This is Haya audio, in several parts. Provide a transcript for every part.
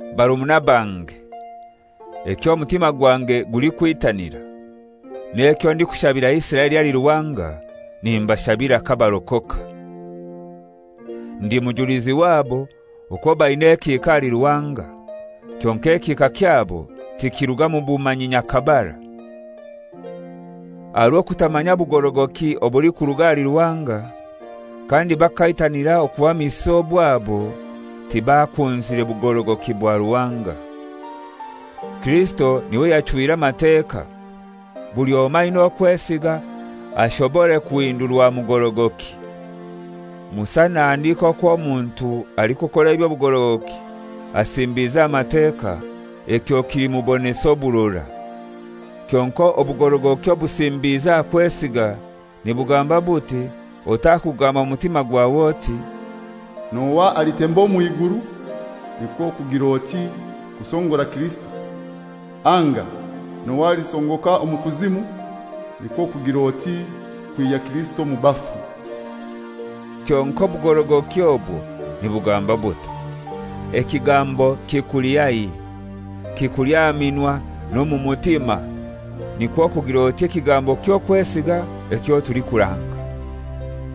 Barumuna bange, eky'omutima gwange gulikwitanira, n'ekyo ndikushabira Isiraeli ahali Ruhanga nimbashabira kabarokoka. Ndi mujulizi wabo okwo baina ekihika ahali Ruhanga, kyonkai ekihika kyabo tikiliruga mu bumanyi nyakabara. Aha rw'okutamanya bugorogoki obulikuruga ahali Ruhanga, kandi bakaitanira okuhamisa obwabo, tibakunzire bugorogoki bwa Ruhanga. Kirisito n'iwe yachwire Amateka, buli omoi aina okwesiga ashobore kuhindurwa kuba mugorogoki. Musa nahandika okw'omuntu alikukora eby'obugorogoki asimbize aha Mateka ekyo kilimubonesa oburora. Kyonkai obugorogoki obusimbize aha kwesiga nibugamba buti: Otakugamba mu mutima gwawe oti, «N'ohai alitemba omw'iguru?» (Nikwo kugir'oti, kusongora Kirisito) anga, «N'ohai alisongoka omu kuzimu?» (Nikwo kugir'oti, kwihya Kirisito omu bafu). Kyonkai obugorogoki obwo nibugamba butai? Ekigambo kikuli haihi, kikuli aha minwa n'omu mutima (nikwo kugir'oti, ekigambo ky'okwesiga ekyo tulikuranga).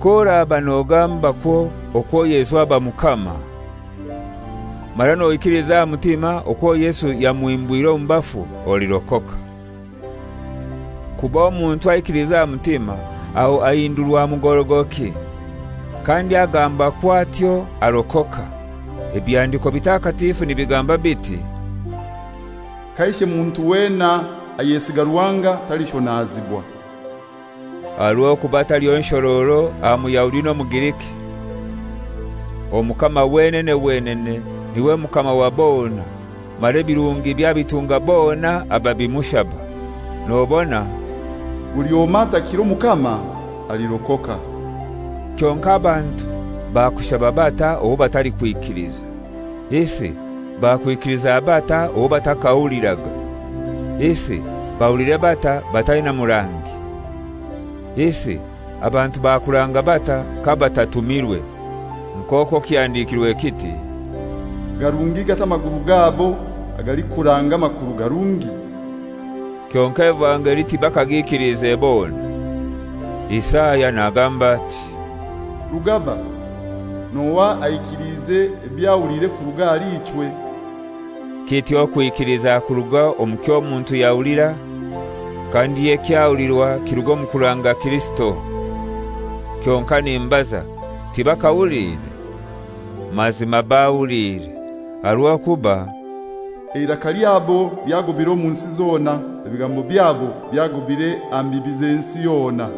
K'oraba nogambakwo okwo Yesu aba Mukama, mara noikiliza aha mutima okwo Yesu yamuhimbwire omu bafu, olirokoka. Kuba omuntu aikiliza aha mutima aho ahindurwa mugorogoki, kandi agambakwo atyo arokoka. Ebihandiko bitakatifu nibigamba biti, «Kaishe muntu wena ayesiga Ruhanga talishonazibwa.» Aha rw'okuba taliho nshororo aha Muyahudi n'Omugriki. Omukama wenene wenene n'iwe Mukama wa bona, mara ebirungibye abitunga bona ababimushaba. Nobona «Buli omoi atakira Omukama, alirokoka.» Kyonkai abantu bakushaba batai owo batalikwikiliza? Isi bakwikiliza batai owo batakahuliraga? Isi bahulire batai bataina murangi? Isi abantu bakuranga batai kabatatumirwe? Nk'okwo kihandikirwe kiti, «Garungi gatai amaguru gabo agalikuranga amakuru garungi!» Kyonkai evangeli tibakagikilize bona; Isaya nagamba ati, «Rugaba, n'ohai aikiliize eby'ahuliire kuruga ahali ichwe?» Kityo okwikiliza kuruga omu ky'omuntu yahulira, kandi ekyahulirwa kiruga omu kuranga Kirisito. Kyonkai nimbaza, tibakahuliire? Mazima bahuliire; aha rw'okuba «Eiraka lyabo lyagobire omu nsi zona, ebigambo byabo byagobire aha mbibi z'ensi yona.»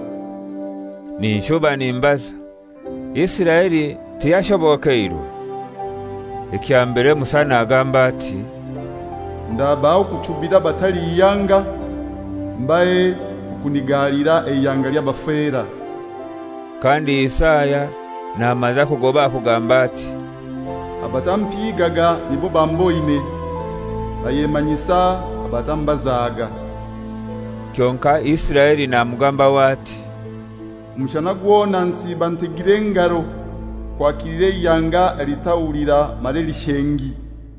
Ninshuba nimbaza, Isiraeli tiyashobokeirwe? Ekya mbere Musa nagamba ati, «Ndabaha okuchubira abatali ihanga; mbahe okunigalira eihanga ly'abafera.» Kandi Isaya namaza kugoba aha kugamba ati, «Abatampiigaga nibo bamboine, nayemanyisa abatambazaga.» Kyonkai Isiraeli namugambaho ati, «Omushana gwona nsiiba ntegire engaro kwakilira eihanga elitahulira mara elishengi.»